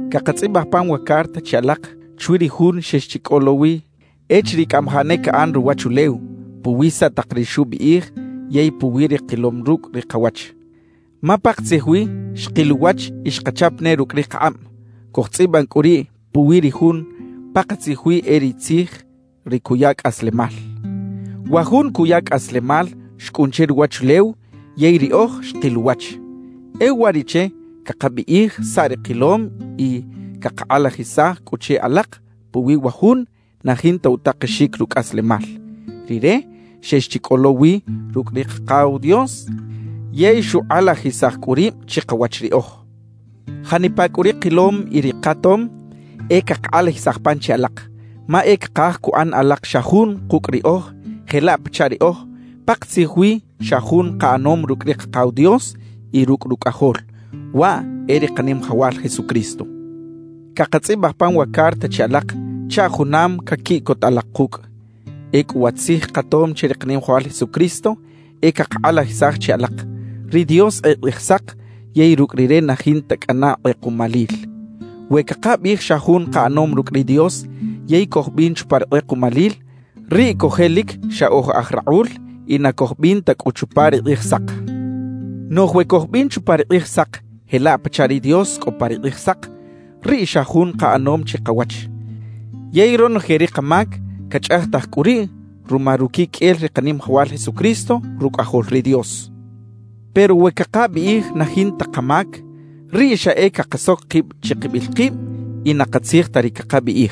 Cakatzꞌibaj pan wa carta che alak chwi ri Jun xex chi cꞌo lo wi echiriꞌ cꞌamajaꞌ ne caꞌan ruwachulew, puwi saꞌ tak ri xubiꞌij yey puwi ri kilom rucꞌ ri kawach. Ma pakatzij wi xkil uwach y xkachap ne rucꞌ ri kakꞌab. Cojtzꞌiban cꞌu riꞌ puwi ri Jun pakatzij wi e ri Tzij, ri cuya cꞌaslemal. Wa Jun cuya cꞌaslemal xcꞌun che ruwachulew yey riꞌoj xkil uwach. E uwariꞌche cakabiꞌij saꞌ ri kilom y cakakꞌalajisaj cꞌu che alak puwi wa Jun na jinta utakexic rucꞌaslemal. Rire xex chi cꞌo lo wi rucꞌ ri Kakaw Dios yey xukꞌalajisaj cꞌu rib chikawach riꞌoj. Janipa cꞌu ri kilom y ri katom, e cakakꞌalajisaj pan che alak; ma e cakaj cuꞌan alak xa jun kucꞌ riꞌoj jelaꞌ pachaꞌ riꞌoj pakatzij wi xa jun kaꞌanom rucꞌ ri Kakaw Dios y rucꞌ Rucꞌajol, waꞌ e ri Kanimajawal Jesucristo. Cakatzꞌibaj pan wa carta che alak chaꞌ junam caquiꞌcot alak kucꞌ. Ecꞌu wa tzij katom che ri Kanimajawal Jesucristo e cakakꞌalajisaj che alak: Ri Dios e Kꞌijsak yey rucꞌ Rire na jinta cꞌana kꞌekuꞌmalil. We cakabiꞌij xa jun kaꞌanom rucꞌ ri Dios yey cojbin chupa ri kꞌekuꞌmalil, riꞌ cojelic xa oj aj rakꞌul y na cojbin ta cꞌu chupa ri Kꞌijsak. Noꞌj we cojbin chupa ri Kꞌijsak jelaꞌ pachaꞌ ri Dios cꞌo pa ri Kꞌijsak, riꞌ xa jun kaꞌanom chikawach. Yey ronoje ri kamac cachꞌajtaj cꞌu riꞌ ruma ruquiqꞌuel ri Kanimajawal Jesucristo, Rucꞌajol ri Dios. Pero we cakabiꞌij na jinta kamac, riꞌ xa e cakasoc kib chikibil kib y na katzij ta ri cakabiꞌij.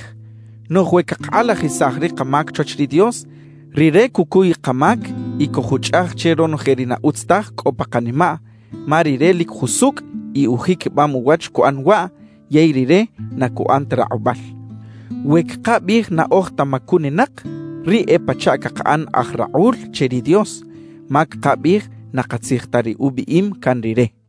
Noꞌj we cakakꞌalajisaj ri kamac chwach ri Dios, Rire cucuy kamac y cojuchꞌaj che ronoje ri na utz taj cꞌo pa kanimaꞌ, ma Rire lic jusucꞌ y ujiquibam uwach cuꞌan waꞌ yey Rire na cuꞌan ta rakꞌubal. We cakabiꞌij na oj ta macuninak, riꞌ e pachaꞌ cakaꞌan aj rakꞌul che ri Dios, ma cakabiꞌij na katzij ta ri ubiꞌim can Rire.